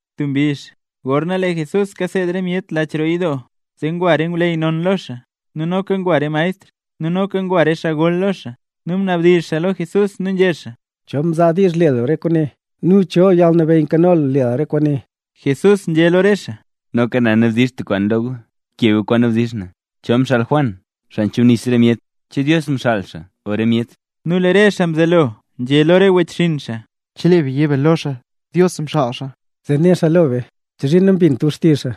Tub mbizh gorna lee Jesús kaseed re myet lach roo yidoo, zee ngwa re ngwleyy non lo xaa, nu noka ngwa re maestr, nu noka ngwa re xaa gol lo xaa. —¿Cho mzaa diizh le lu re kwaane? nu ¿cho yalnabeyy nkano lu le lu re kwaane? Jesús nzhé lo re xaa: —Noka na nabdizh tub kwaan lo gu, keb gu kwaan nabdizh na. ¿Cho xaa mxaal Juan, xaa mchubnis re myet? ¿Che Dios mxaal xaa o re myet? Nu lee re xaa mzelo nzhé lo re wechxinn xaa: —Chelee be yé be lo xaa: “Dios mxaal xaa”, zee né xaa lo be: “¿Chozhiin nambint gu xtizh xaa?”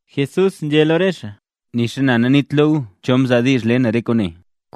Jesús nzhé lo re xaa: —Nixa na naniit lo gu cho mzaa diizh le na re kwaane.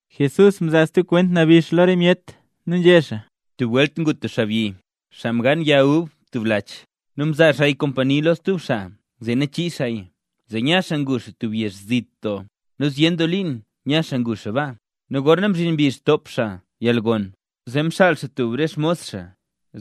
Jesús mzaa stub kwent nabix lo re myet nu nzhé xaa: —Tub welt ngu tub xaabyi, xaa mgaan yag ub tub lach. Nu mzaa xaaya kompani lo stub xaa zee nachii xaaya, zee nya xaa ngu xaa tub yezh zit doo, nu zyen doo liin nya xaa ngu xaa baa. Nu gorna mzhin mbizh top xaa yalgon, zee mxaal xaa tub re xmos xaa,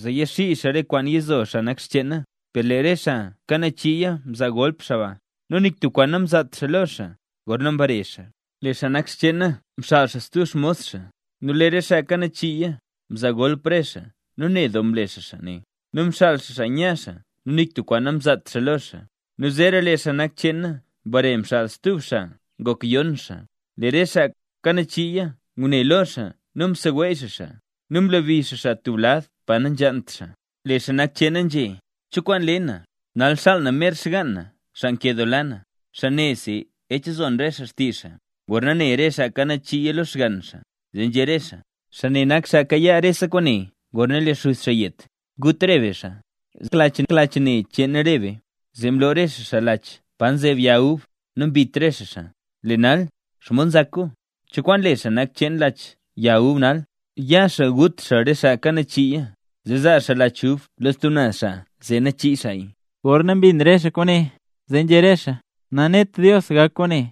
zee yaxii xaa re kwaana yizo xaa nak cheena. Per lee re xaa kanachiiya mzaa golp xaa ba, nu nik tub kwaan namzaat xaa lo xaa gorna mbare xaa. Lee xaa nak cheena mxaal stub xmos xaa, nu lee re xaa kanachiiya, mzaa golp re xaa nu ned doo mle xaa xaa ne, nu mxaal xaa xaa nya xaa nu nik tub kwaan namzaat xaa lo xaa. Nu zeera lee xaa nak cheena mbare mxaal stub xaa ngok yon xaa. Lee re xaa kanachiiya ngune lo xaa nu mseweey xaa xaa, nu mlebi xaa xaa tub lad pa nanzhaant xaa. Zee lee xaa nak cheena nzhé: “¿Cho kwaan le na? Nal xaal na mer xgaan na, xaa nkedoola na, xaa nesi ech zon re xaa xtizh xaa.” Gorna ne re xaa kanachiiya lo xgann xaa, zee nzhé re xaa: “Xaa ne nak xaa kayaa rese kwaane gorna lee xuz xaa yet. Gut re be xaa, zee gak lach ne cheen re be.” Zee mloo re xaa xaa lach pa nzeb yag ub nu mbit re xaa xaa. Lee nal, ¿xomod nzak gu? ¿cho kwaan le xaa nak cheen lach yag ub nal? Ya xaa nu gut xaa re xaa kanachiiya, zee zaa xaa lach ub lo stub naz xaa zee nachii xaaya. Gorna mbin re xaa kwaane, zee nzhé re xaa: —¡Nanet Dios gak kwaane!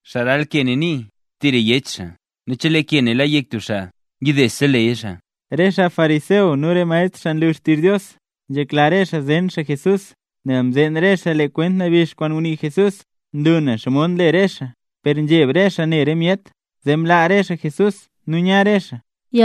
Xaa ral ke ne nii tira yech xaa; nu chelee ke ne la yek tub xaa, yidese leya xaa. Re xaa fariseo nu re maestr xaa nlu xtizh Dios, nzhekla re xaa zen xaa Jesús, nel mzeen re xaa lee kwent nabix kwaan ngunii Jesús nlu nen xomod nle re xaa. Per nzheb re xaa ne re myet, zee mlaa re xaa Jesús nu nya re xaa.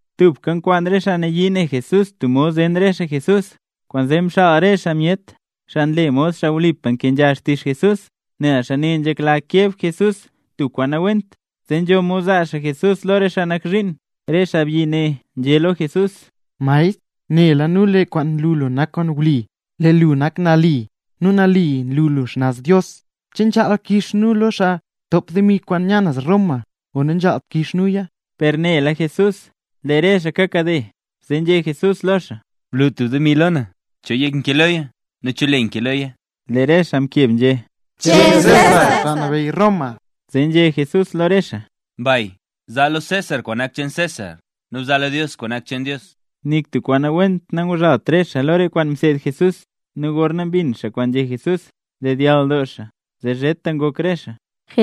Tubka nkwaan re xaa nayii ne Jesús tub mod zen re xaa Jesús. Kwaanzee mxaal re xaa myet, xaa mle mod xaa wlipa nkenzha xtizh Jesús nel xaa ne nzhekla keb Jesús tub kwaan nawent, zee nzho mod zaa xaa Jesús lo re xaa nak zhiin. Re xaabyi ne nzhé lo Jesús: —Maestr, nela nu lee re kwaan nlu lu nak kwaan wli, lee lu nak xaa nali lo re myet, nu nali nlu lu xnaz Dios lo re myet. ¿Che nzhaal kix nu lo xaa kwaan ntop demi kwaan nya naz Roma o nanzhaalt kix nuya? Per Jesús nela lee re xaa kakade, zee nzhé Jesús lo xaa: —Blu tub demi lo na. ¿Cho yek nkee loya? ¿Nu cho le nkee loya? Lee re xaa mkeb nzhé: —Cheen César, xaa nabeyy Roma. Zee nzhé Jesús lo re xaa: —Mbay. Zaa gu lo César kwaan nak xcheen César, nu bzaa gu lo Dios kwaan nak xcheen Dios. Nik tub kwaan nawent nanguzhalt re xaa lo re kwaan mseed Jesús. Nu gorna mbin xaa kwaan nzhé Jesús, mdedyall doo xaa zee zheta ngok re xaa.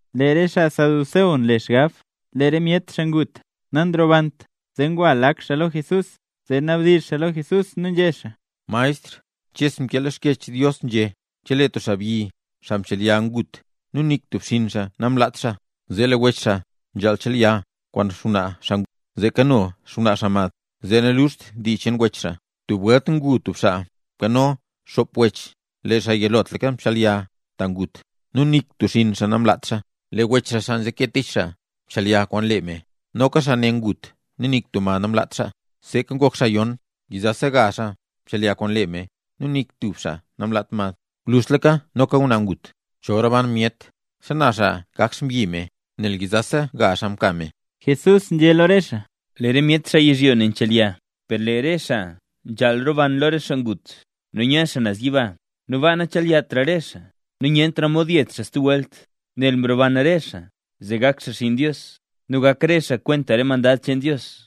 Lee re xaa saduceo nle xgab, lee re myet xaa ngut, nanrobant. Zee ngwa lak xaa lo Jesús, zee nabdizh xaa lo Jesús, nu nzhé xaa: —Maestr, Ches mkee lo Xkyech Dios nzhé: “Chelee tub xaabyi, xaa mchelya ngut nu nik tub xinn xaa namlaat xaa, zee lee wech xaa nzhaal chelya kwaan xngwnaa xaa ngut, zee kano xngwnaa xaa mad, zee naluxt dii cheen wech xaa”. Tub welt ngu tub xaa nkano xop wech. Lee xaa yilotlaka mchelya, ta ngut xaa. Nu nik tub xinn xaa namlaat xaa. Lee wech xaa, xaa nzeke tich xaa, mchelya kwaan lee me, nu noka xaa ne ngut nu nik tub mad namlaat xaa. Nu seeka ngok xaa yon. Nu yizasa gaazh xaa mchelya kwaan lee me nu nik tub xaa namlaat mad. Nu gwluzhtlaka noka ngwnaa ngut. Chol roban re xaa, ¿xana xaa gak xmbyi me, nel yizasa gazh xaa mka me? Jesús nzhé lo re xaa: —Lee re myet xaa yizhyo ne nchelya. Per lee re xaa nzhaal roban lo re xaa ngut, nu nya xaa naz yiba, nu baa nachelyatra re xaa. Nu nyentra mod yet xaa stub welt, nel mroban re xaa zee gak xaa xinn Dios. Nu gak re xaa kwenta re mandad cheen Dios.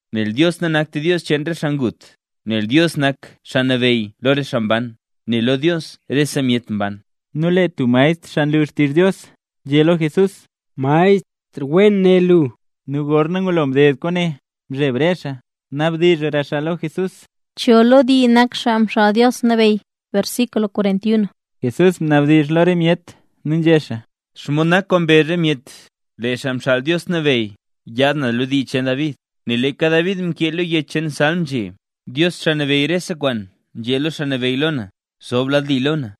¡Nel Dios nanakt Dios cheen re xaa ngut; nel Dios nak xaa nabeyy lo re xaa mban, nel lo Dios rese myet mban! Nu lee tub maestr xaa nlu xtizh Dios, nzhé lo Jesús: —¡Maestr, wen né lu! Nu gorna ngulo mded kwaane, mzheb re xaa nabdizhra xaa lo Jesús. ¿Cho lo dii nak Xaa Xaal Dios Nabeyy? Jesús mnabdizh lo re myet nu nzhé xaa: —¿Xomod nak kwaan mbezh re myet, lee Xaa Xaal Dios Nabeyy yaad naz lo dii cheen David? Nel leeka David mkee lo yech cheen Salm nzhé: Dios, Xaa Nabeyy rese kwaan, nzhé lo Xaa Nabeyy lo na: “Zob lad li lo na,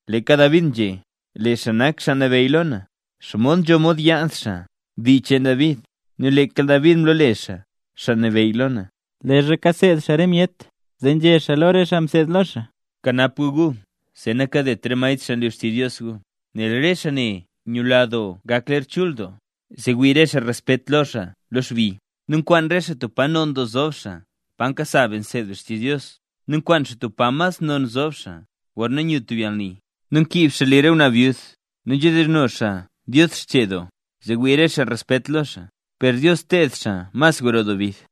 ’Leeka David nzhé: “Lee xaa nak Xaa Nabeyy lo na”. ¿Xomod nzho mod yaad xaa dii cheen David nu leeka David mlole xaa: “Xaa Nabeyy lo na”? Leezha kaseed xaa re myet zee nzhé xaa lo re xaa mseed lo xaa: —Kanap gu gu zee nakadet re maestr xaa nlu xtizh Dios gu, nel re xaa ne nyula doo gak ler chul doo, zee wii re xaa respet lo xaa lo xbi. Nu nkwaan re xaa tub pa non doo zob xaa pa nkasa be nseed be xtizh Dios, nu nkwaan xaa tub pa mas non nzob xaa gorna nyu tub yalni. Nu nkiib xaa li re ngwnaa byud. Nu nzhedizhno xaa Dios xchee doo, zee wii re xaa respet lo xaa. ¡Per Dios ted xaa mas gro doo bid!